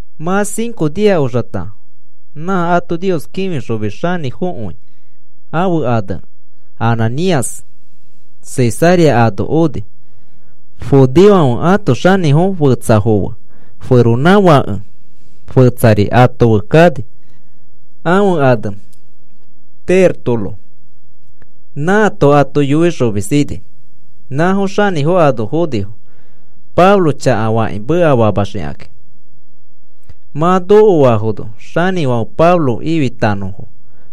Mã cinco nia oxata nã ato Nios kĩfixomis xanĩfokõi, ãfe ane Ananías, Cesarea ano oni. Judeofãfe ãto xanĩfo fetsafo fe feronãfake fetsari ato fe kani, ãfe ane Tértulo, nãato ato yoixomis ini. Nãfo xanĩfo ano fonifo, Pablo chakafakĩ mekafaxikakĩ. Mã nokoafono xanĩfãfe Pablo ifitanõfo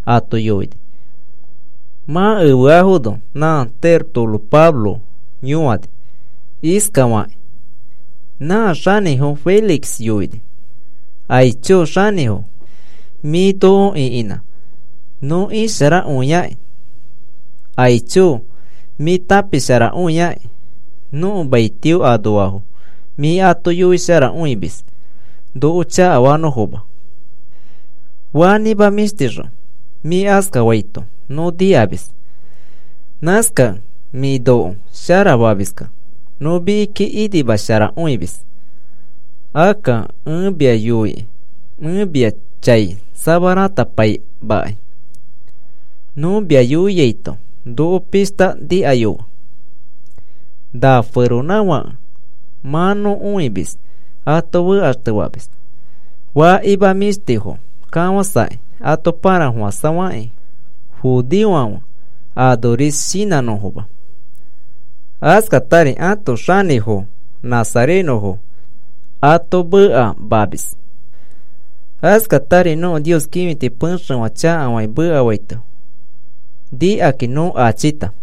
ato yoini. Mã efeaifono nã Tértulo Pablo yõani. Iskafakĩ nã xanĩfo Félix yoini: “Aicho xanĩfo, mĩ noko ĩkinã nõ isharakõiaki. Aicho mĩ tãpisharakõiaki nõko maitio anoafo mĩ ato yoisharakõimis noko chakafanõfoma. Fanĩmã mĩshtixõ mĩ askafaito nõ nikamis. Nãskakẽ mĩ noko sharafamiskẽ nõ mikiki inimasharakõimis. Akka ẽ mia yoikĩ, ẽ mia chai samaratapaimakai. Nõ mia yoiaito noko pishta nikayofe. Na feronãfake mã nõ õimis ato fekaxtefamis, fakima mĩshtifo kafãsakĩ ato pãrafofãsafakĩ judeofãfe anoris shinãnõfoma. Askatari ãto xanĩfo nazarenõfo ato mekamamis. Askatari nõko Nios kĩfiti pexefã chakafakĩ mekafaito nikakĩ nõ achita.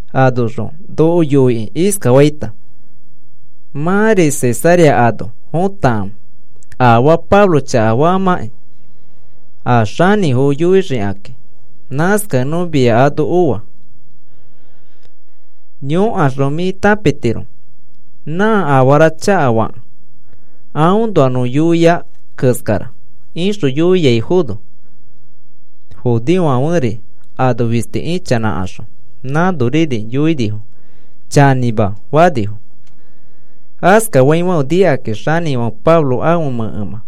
Anoxõ noko yoikĩ iskafaita: ‘Mãri Cesarea ano fotakãfe afaa Pablo chakafamãkĩ, a xanĩfo yoixikakĩ.’ Nãskakẽ nõ mia ano oa. Yõkaxõ mĩ tãpitiro nã afara chakafakẽ aõnoa nõ yoiai keskara,” ixõ yoiaifono, judeofãferi ano fisti ichanãkaxõ, nãnoriri yoinifo: “Chanĩma,” fanifo. Askafaifãfe nikakĩ xanĩfãfe Pablo ãfe mẽkemã,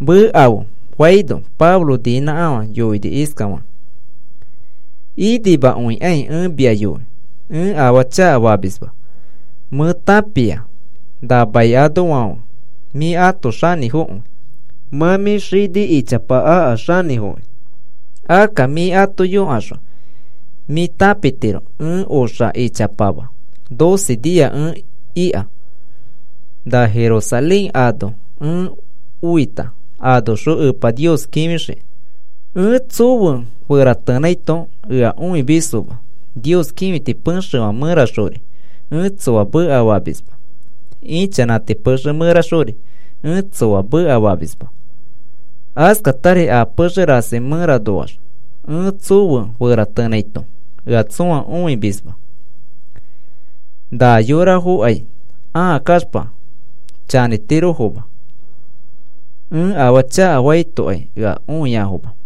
“Mekafe,” faino, Pablo niinãkafã yoini iskafakĩ: “Inimakõikai ẽ mia yoi ẽ afaa chakafamisma. Mẽ tãpia na mai anoafãfe mĩ ãto xanĩfokõi, mã mĩ xini ichapa aka xanĩfokĩ. Akka mĩ ato yõkaxõ mĩ tãpitiro ẽ oxa ichapama doce nia ẽ ika na Jerusalén ano ẽ oita anoxõ Epa Nios kĩfixikĩ. Ẽ tsofe feratenãito ea õimisfoma, Nios kĩfiti pexefã mẽraxori ẽ tsoa mekafamisma, ichanãti pexe mẽraxori ẽ tsoa mekafamisma, askatari a pexe rasi mẽranoax ẽ tsofe feratenãito ea tsõa õimisma. Na yorafokai ãa kaxpa chanĩtirofoma, ẽ afaa chakafaitokai ea õiafoma.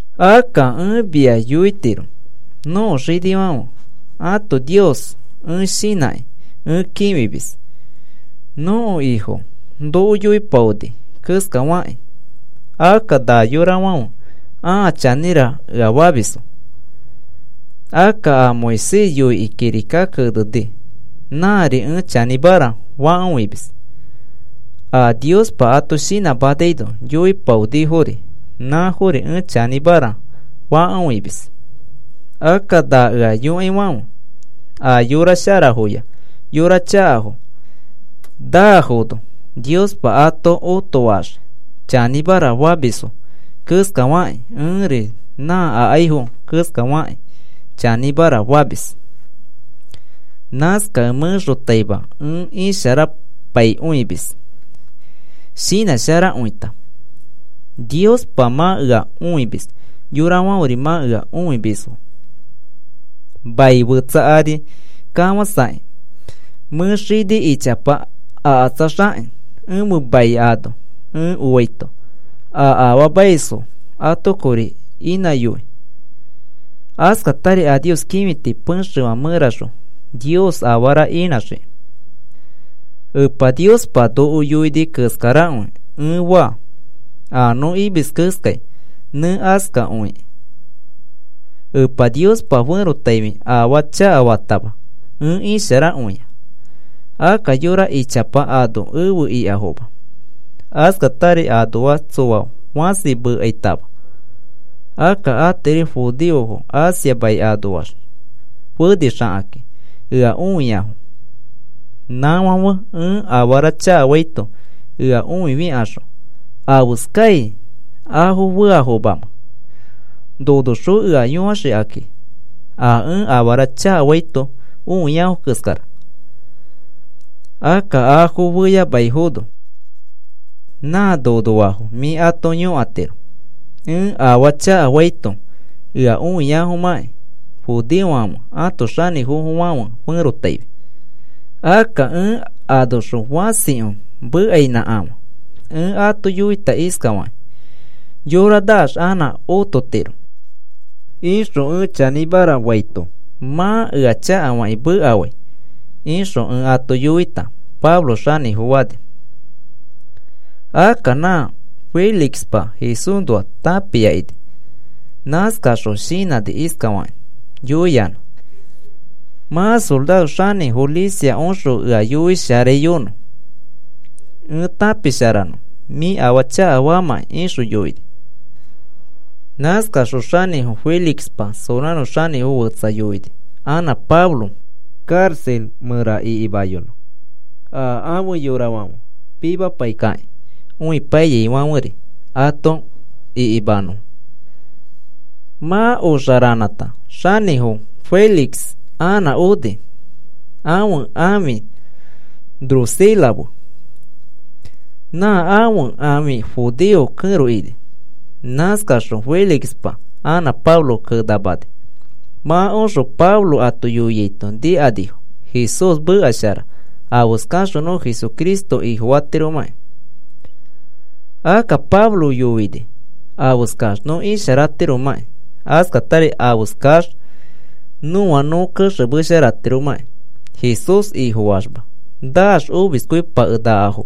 Akka ẽ mia yoitiro nõko xinifãfe ãto Nios ẽ shinãkĩ ẽ kĩfimis. Nõko Ifo noko yoipaoni keskafakĩ akka na yorafãfe ãa chanĩra ea famisfo. Akka a Moisés yoikĩ kirika keneni nãri ẽ chanĩmara fakõimis. A Niospa ato shinãmanaino yoipaonifori, nãfori ẽ chanĩmara fakõimis. Akka na ea yõaifãfe a yora sharafoya yora chakafo nafono Niospa ato otofaxii chanĩmara famisfo keskafakĩ ẽri nã akaifo keskafakĩ chanĩmara famis. Nãskakẽ mẽxotaima ẽ isharapaikõimis, shinãsharakõita. Niospa mã ea õimis, yorafãferi mã ea õimisfo. “Mai fetsa ari kafãsakĩ mẽ xini ichapa akatsaxakĩ, ẽfe mai ano ẽ oita a afaamaisfo ato kori inãyoi, askatari a Nios kĩfiti pexefã mẽraxõ Nios afara inãxiki. Epa Niospa noko yoini keskarakõi ẽ faa. A nõ imis keskai nẽ askakõikĩ Epa Niospa ferotaifi afaa chakafatama ẽ isharakõia. Akka yora ichapa ano efe ikafoma. Askatari anoax tsoa fãsi mekaitama. Akka atiri judeofo Asia mai anoax fenixakakĩ ea õiafo. Nãfãfe ẽ afara chakafaito ea õifikaxõ ¿afeskai afo feafomamamẽ, nonoxõ ea yõaxikaki a ẽ afara chakafaito õiafo keskara? Akka afo feyamaifono, nã nonoafo mĩ ato yõkatiro ẽ afaa chakafaito ea õiafomãki judeofãfe ãto xanĩfofofãfe ferotaifi. Akka ẽ anoxõ fãsikõi mekainãkafã ẽ ato yoita iskafakĩ: ‘Yora naax anã ototiro,’ ixõ ẽ chanĩmara faito, mã ea chakafakĩ mekafai ixõ ẽ ato yoita,” Pablo xanĩfo fani. Akka na Félixpa Jesúsnoa tãpia ini. Nãskaxõ shinãni iskafakĩ yoiyanã: “Mã soraro xanĩfo Lisias oxõ ea yoisharaiyonõ ẽ tãpisharanõ mĩ afaa chakafaamãkĩ,” ixõ yoini. Nãskaxõ xanĩfo Félixpa soraro xanĩfo fetsa yoini anã Pablo karaxa mẽra ikimayonõ a ãfe yorafãfe pimapaikakĩ õipaiyaifãferi ato ikimanõ. Mã oxa ranãta xanĩfo Félix anã oni ãfe ãfi Drusila fe. Nã ãfe ãfi judeo kẽro ini. Nãskaxõ Félixpa anã Pablo kenamani. Mã oxõ Pablo ato yoiaito nikanifo Jesús meka shara afeskaxõ nõ Jesucristo Ifofatiromãkĩ. Akka Pablo yoini afeskax nõ isharatiromãkĩ, askatari afeskax nõa nõ kexemesharatiromakĩ. Jesús Ifofaxma naax omiskõipakenakafo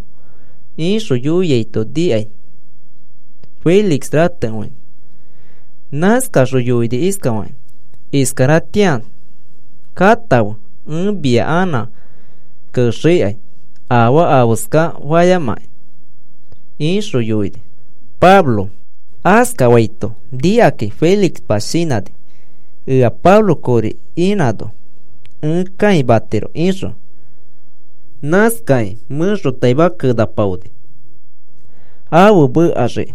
ixõ yoiaito nikai Félix ratekõini. Nãskaxõ yoini iskafakĩ: “Iskaratĩa katãfe ẽ mia anã kenaxikai afaa afeska fayamakĩ,” ixõ yoini. Pablo askafaito nikakĩ Félixpa shinãni ea Pablo kori inãno ẽ kãimatiro ixõ. Nãskakĩ mẽxotaima kenapaoni afe mekaxiki.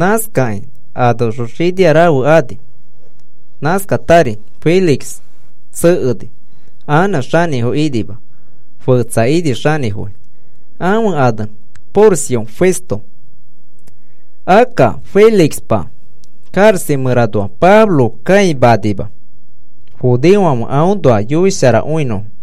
Nãskakĩ anoxõ xinia rafe anifo. Nãskatari Félix tsekeni anã xanĩfo inima, fetsa ini xanĩfoi, ãfe ane Porcio Festo. Akka Félixpa karaxa mẽranoa Pablo kãimanima, judeofãfe aõnoa yoisharakõinõfo.